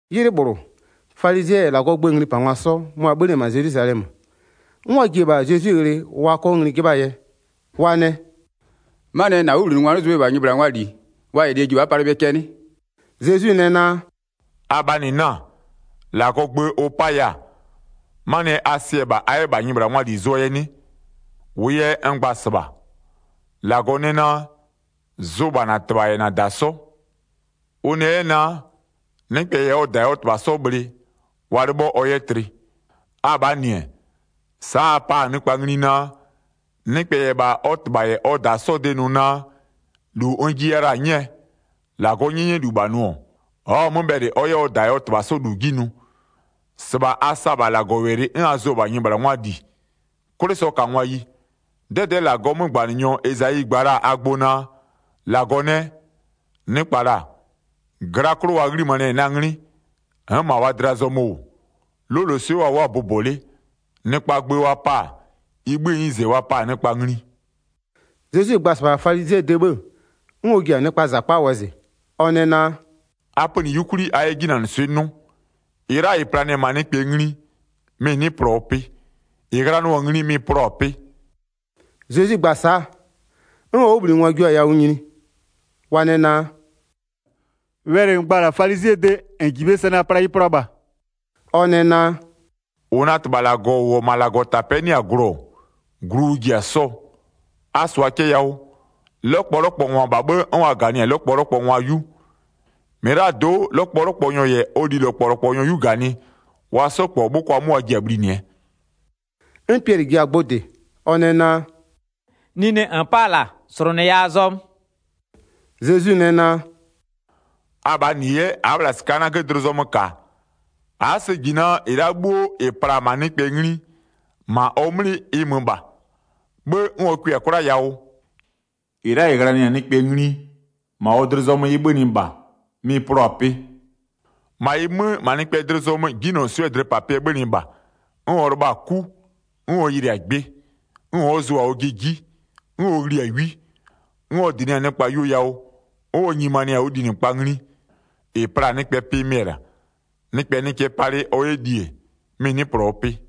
'Ylɩ -bhlʋ, falizɩɛ -yɛ -Lagɔɔ gböö nglipangwa 'sɔ, mʋa-a 'bhönɩ-ɛ -ma Zelwizalɛmö, 'n wa ji-e -bha Zezwi ghlɩ wa 'kɔ ngli 'jɩbhaa yɛ. Wa nɛ: “'Manɩɛ yɛ -na 'wʋbhlinɩngwa 'nɩ zʋ bhe -bha nyɩbhlangwaa -li wa -yɛ lie ji 'n wa'a palɩ bhe cɛ 'nɩ?” Zezwi nɛ naa: “Abhaa -nɩ 'na-a? -Lagɔɔ gbö ʋ 'paya-a, 'manɩɛ yɛ a sɩ-ɛ -bha a 'yɛ -bha nyɩbhlangwaa -li zʋɔ yɛ 'nɩ? 4-Wʋʋ yɛ n gba-a -sɩbha, -Lagɔ nɛ naa: Zʋ -bha -na -tɩbha -yɛ -na -da 'sɔ. Ʋ nɛ 'yɛ naa: Nɩkpɛ -yɛ ɔ -tɩbha -yɛ ɔ -da 'sɔ bhlɩ, wa 'lɩbhɔ ɔ 'yɛ tlɩ. Abhaa -nɩ-ɛ, sa'a a pa-a nɩkpa ngli naa: Nɩkpɛ -yɛ -bha ɔ -tɩbha -yɛ ɔ -da 'sɔɔ de nʋ naa: -Lu n jiya la-a 'nyɛɛ, -Lagɔɔ 'nyɛnyɛlu -bha nʋ-ɔ, ɔ'ɔ-a 'mö bhɛlɩ ɔ 'yɛ ɔ -tɩbha -yɛ ɔ -da 'sɔ -lu 'ji nʋ. 6-Sɩbha a sa-a -bha -Lagɔwɛlɩ 'n a zʋ-ɔ -bha nyɩbhlangwaa -li. 'Kwlɩsɔkangwayi, 'dɛdɛ'ɛ -Lagɔɔ 'mögbanɩnyɔ Ezayi gba la-a a gbʋ naa: 8-Lagɔ nɛ: Nɩkpa -la, gla 'klʋ wa 'ghlimanɩ-ɛ na 'nglɩ, n'n -ma wa dlɩa zɔmö -wʋ. 'Loloswɩ'ɩ wa wʋ'ʋ-a bʋbɔ 'le. Nɩkpaa gbö wa pa-a, ɩ 'bhïë 'nyize wa pa-a nɩkpa ngli.” Zezwi gba-a -sɩbha falizɩɛ de 'bhë, 'n ɔ ji-a nɩkpaa -zakpa wɔzɩ, ɔ nɛ naa: “A pönɩ 'yukwli a 'yɛ 'jinanɩswɩ'ɩ 'nʋ. 11-Ɩ la'a -ɩ planɩ-ɛ -ma nɩkpɛɛ ngli, mɩ-ɩ 'nɩ plɔɔ pɩ. -Ɩ ghlanɩɔ-a ngli, mɩ-ɩ plɔ-a pɩ.” Zezwi gba-a sa'a, 'n ɔ 'wʋbhlinɩngwa jio-a yawʋ nyini, wa nɛ naa: “Wɛlɩ -n gba-a -la falizɩɛ de, -n -ji bhe sɛ naa, pla ɩ plʋa -bha?” Ɔ nɛ naa: “-Ʋ na -Tɩbha -Lagɔ -ʋ -wʋ-ɔ -ma -Lagɔtapɛ'ɛ 'nɩ-a glʋ-ɔ, glu ʋ ji-a sɔɔ. A -sʋa cɛ yawʋ, 'lɔkpɔlɔkpɔngwa -bha 'bhë 'n wa -ganɩ-a lɔkpɔlɔkpɔngwa 'yu, -mɩlado'o, 'lɔkpɔlɔkpɔnyɔ -yɛ ɔ lilɔkpɔlɔkpɔnyɔ 'yu -ganɩ, wa 'sɔ -kpɔ 'bhʋkwa 'mö wa ji-a bhlinɩɛ.” 'N Piɛlɩ ji-a gbʋ -dɩ, ɔ nɛ naa: “Nine -n 'pa-a -la, -slʋnʋya a zɔmö.” Zezwi nɛ naa: “Abhaa -nɩ 'yɛ a'a -bhla -sɩka'a 'nagö dlɩ zɔmö -ka? A'a sɛ -ji naa -ɩ la'a 'bhuo -ɩ pla-a -ma nɩkpɛɛ ngli, -ma ɔ 'mlɩ ɩ mö -bha, 'bhë 'n ɔ kʋɩ-a 'kwla yawʋ? 18-Ɩ la'a -ɩ ghlanɩ-a nɩkpɛ ngli, -ma ɔ dlɩ zɔmö ɩ 'bhönɩ -bha, mɩ-ɩ plɔ-a pɩ. 19-Ma ɩ 'mö, -ma nɩkpɛɛ dlɩ zɔmö 'jinylɔswɩ'ɩɛ dlɩpapɩɛ 'bhönɩ -bha, 'n ɔ lɩbha-a 'ku, 'n ɔ yɩlɩ-a gbɩ, 'n ɔ'ɔ zʋ-a ɔjɩ 'ji, 'n ɔ ghli-a 'wi, 'n ɔ dɩnɩ-a nɩkpa yuo yawʋ, 'n ɔ nyimanɩ-a ɔ linɩkpa ngli. 20-Ɩ pla-a nɩkpɛ pɩ mɩ-ɛ -la, nɩkpɛ nɩ cɛ palɩ ɔ -yɛ li-e, mɩ-ɩ 'nɩ plɔɔ pɩ.”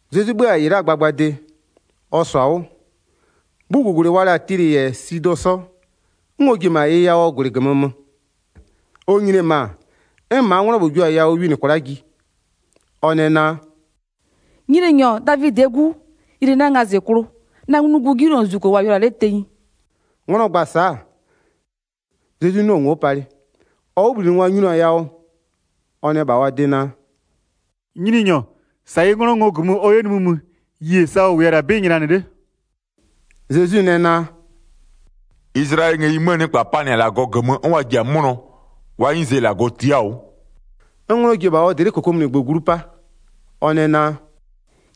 Zezwi 'bhö-a -ɩ la'aa gbagbade, ɔ -sɔ-a 'wʋ, 'bhugugwlɩ wa la-a Tilɩ -yɛ Sidɔ 'sɔ, 'n ɔ ji-e -ma ɩ yawʋɔ -gwlɩ -gömö mö. Ɔ nyini-e -ma, 'n -maa 'nglɔ -bhlʋ jio-a yawʋ winɩ kwla'a ji, ɔ nɛ naa: “Nyininyɔ, Davidɩɛ 'Gu, yɩlɩ na ngazɩklʋ, na nglugu 'jinylozuzuko -wʋ-a yʋlʋa 'le tenyi.” 'Nglɔ gba-a sa'a, Zezwi 'nɩɔ-ɔ ngo'o palɩ. Ɔ 'wʋbhlinɩngwa nyinio-a yawʋ, wa nɛ -bha ɔ de naa: “Nyininyɔ, -sa yɩ 'nglɔ ngo -gömö ɔ 'yɛ nimï mö, yie sa ɔ -wʋya-a -la 'bɩ nylanɩ 'le.” Zezwi nɛ naa: “Izlayɛlɩɛ ngëyi 'möö nɩkpa panɩ-a -Lagɔ -gömö 'n wa ji-a 'mʋnɔ, wa 'nyize -Lagɔ tia'a-a 'wʋ.” 'N 'nglɔ ji-e -bha ɔ dlɩ'ɩ -kokomunigbö glu 'pa. Ɔ nɛ naa: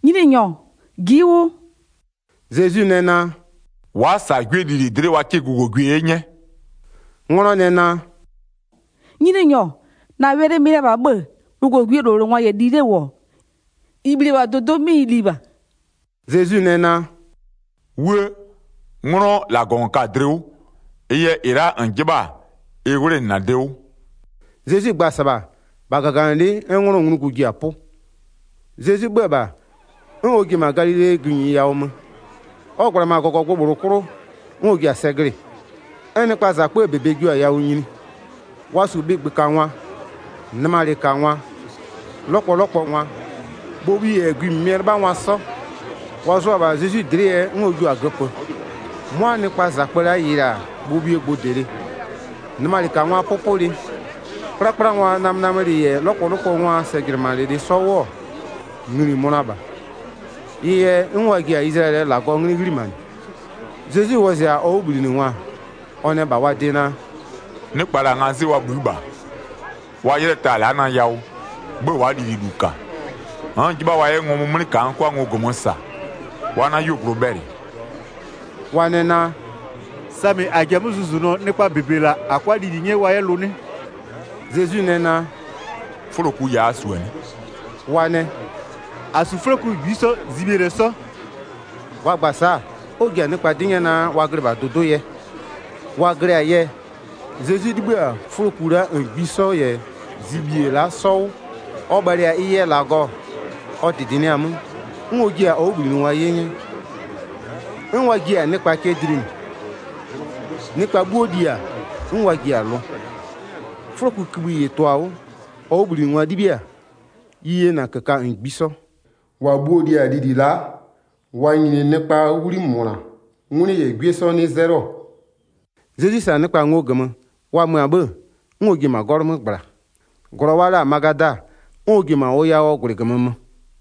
“Nyininyɔ, ji'i 'wʋ.” Zezwi nɛ naa: “Wa'a -sa 'gwie lili dlɩ'ɩ wa 'kɩ gʋgogwie 'ye 'nyɛ.” 'Nglɔ nɛ naa: “Nyininyɔ, -na wɛlɩ mɩ-ɩ la -bha 'bhë-ë, gʋgogwiee -lowlengwa -yɛ li 'le -wʋ-ɔ, -ɩ bhli-e -bha dʋdʋ'ʋ 'mɩ ɩ li -bha.” Zezwi nɛ naa: “'Wuë! 'Nglɔ, -Lagɔ -n ka-a dlɩ 'wʋ. Ɩ yɛ -ɩ la'a -n 'jɩbha-a, ɩ 'wlenɩ -na de 'wʋ.” Zezwi gba-a -sɩbha, -bha -gaganɩlɩ'ɩ 'n 'nglɔɔ nglugu ji-a 'pʋ. Zezwi 'bhö-ö -bha, 'n ɔ ji-e -ma Galilee gïnyi yawʋ mö. Ɔ -gbla-a -ma -gɔgɔgbʋ -bhlʋ 'klʋ 'n ɔ ji-a sɛ glɩ-ɩ. 'N nɩkpaa -zakpöö -bebe jio-a yawʋ nyini. Wa -su bhɩgbökangwa, nɩmalɩkangwa, 'lɔkpɔlɔkpɔngwa, bhobhu -yɛ gwi -mɩmɩɛ 'lɩbhangwa 'sɔ. Wa zʋa-a -bha Zezwi dlɩ'ɩ yɛ 'n ɔ jua-a göpö. 'Mʋa nɩkpaa -zakpö la'a yɩlɩ-a bhobhuo gbʋdɩlɩ, nɩmalɩkangwaa 'pʋpʋlɩ, 'kplakplangwaa namönamölɩ -yɛ 'lɔkpɔlɔkpɔngwaa sɛjɩnɩmanɩlɩ 'sɔ 'wʋ-ɔ, ngli-i mönʋa -bha. Ɩ yɛ 'n wa ji-a Izlayɛlɩɛ -Lagɔɔ 'nglɩ 'ghlimanɩ. Zezwi wɔzɩ-a ɔ 'wʋbhlinɩngwa, ɔ nɛ -bha wa de naa: “Nɩkpa -la, ngazɩ'ɩ wa bhï'ï -bha. Wa 'ylɩɛ ta-a la'a na yawʋ, 'bhë wa'a lililu -ka. N'n-n 'jɩbha wa 'yɛ ngɔmʋ 'mlɩ -ka n 'kʋa ngo -gömö -sa, wa 'na 'yuogblʋ bhɛlɩ.” Wa nɛ naa: “Samɩ -a ji-a 'mö zʋzʋnʋɔ nɩkpa -bebe -la -a 'kʋa lili 'nyɛ wa 'yɛ lʋ 'nɩ?” Zezwi nɛ naa: “'Fʋloku ya a -su-a 'nɩ?” Wa nɛ: “-A -su 'fʋloku -ngbisɔ zibhie -lɛ 'sɔ.” Wa gba-a sa'a, 'n ɔ ji-a nɩkpa 'dɩ 'nyɛ naa wa glɩ -bha dʋdʋ'ʋ yɛ. Wa glɩ-a yɛ, Zezwi 'libhï-a 'fʋloku la'a -ngbisɔ -yɛ zibhie la'a 'sɔ 'wʋ-ɔ, ɔ bhalɩ-a ɩ yɛ -Lagɔ-ɔ, ɔ -dɩdɩnɩɩ-a 'mö, 'n ɔ jiɩ-a ɔ 'wʋbhlinɩngwa 'ye 'nyɛ, 'n wa jiɩ-a nɩkpa cɛ dlinɩ. Nɩkpa 'bhuo li-a, 'n wa ji-a lʋ. 'Fʋlokukïbhï -ɩ tʋ-a 'wʋ, ɔ 'wʋbhlinɩngwa 'libhiɩ-a ɩ yena -köka -ngbisɔ. 38-Wa bhuo-o li-a lili la'a, wa nyini nɩkpaa 'wli -mʋna, 'ngwlɩ -yɛ 'gwie 'sɔ 'nɩ 'zɛlɩɔ-ɔ. Zezwi -sa-a nɩkpa ngo -gömö, wa mö-a 'bhë, 'n ɔ ji-e -ma 'gɔlʋ 'mö -gbla, -glɔ wa la-a Magada 'n ɔ ji-e -ma ʋ yawʋɔ -gwlɩ -gömö mö.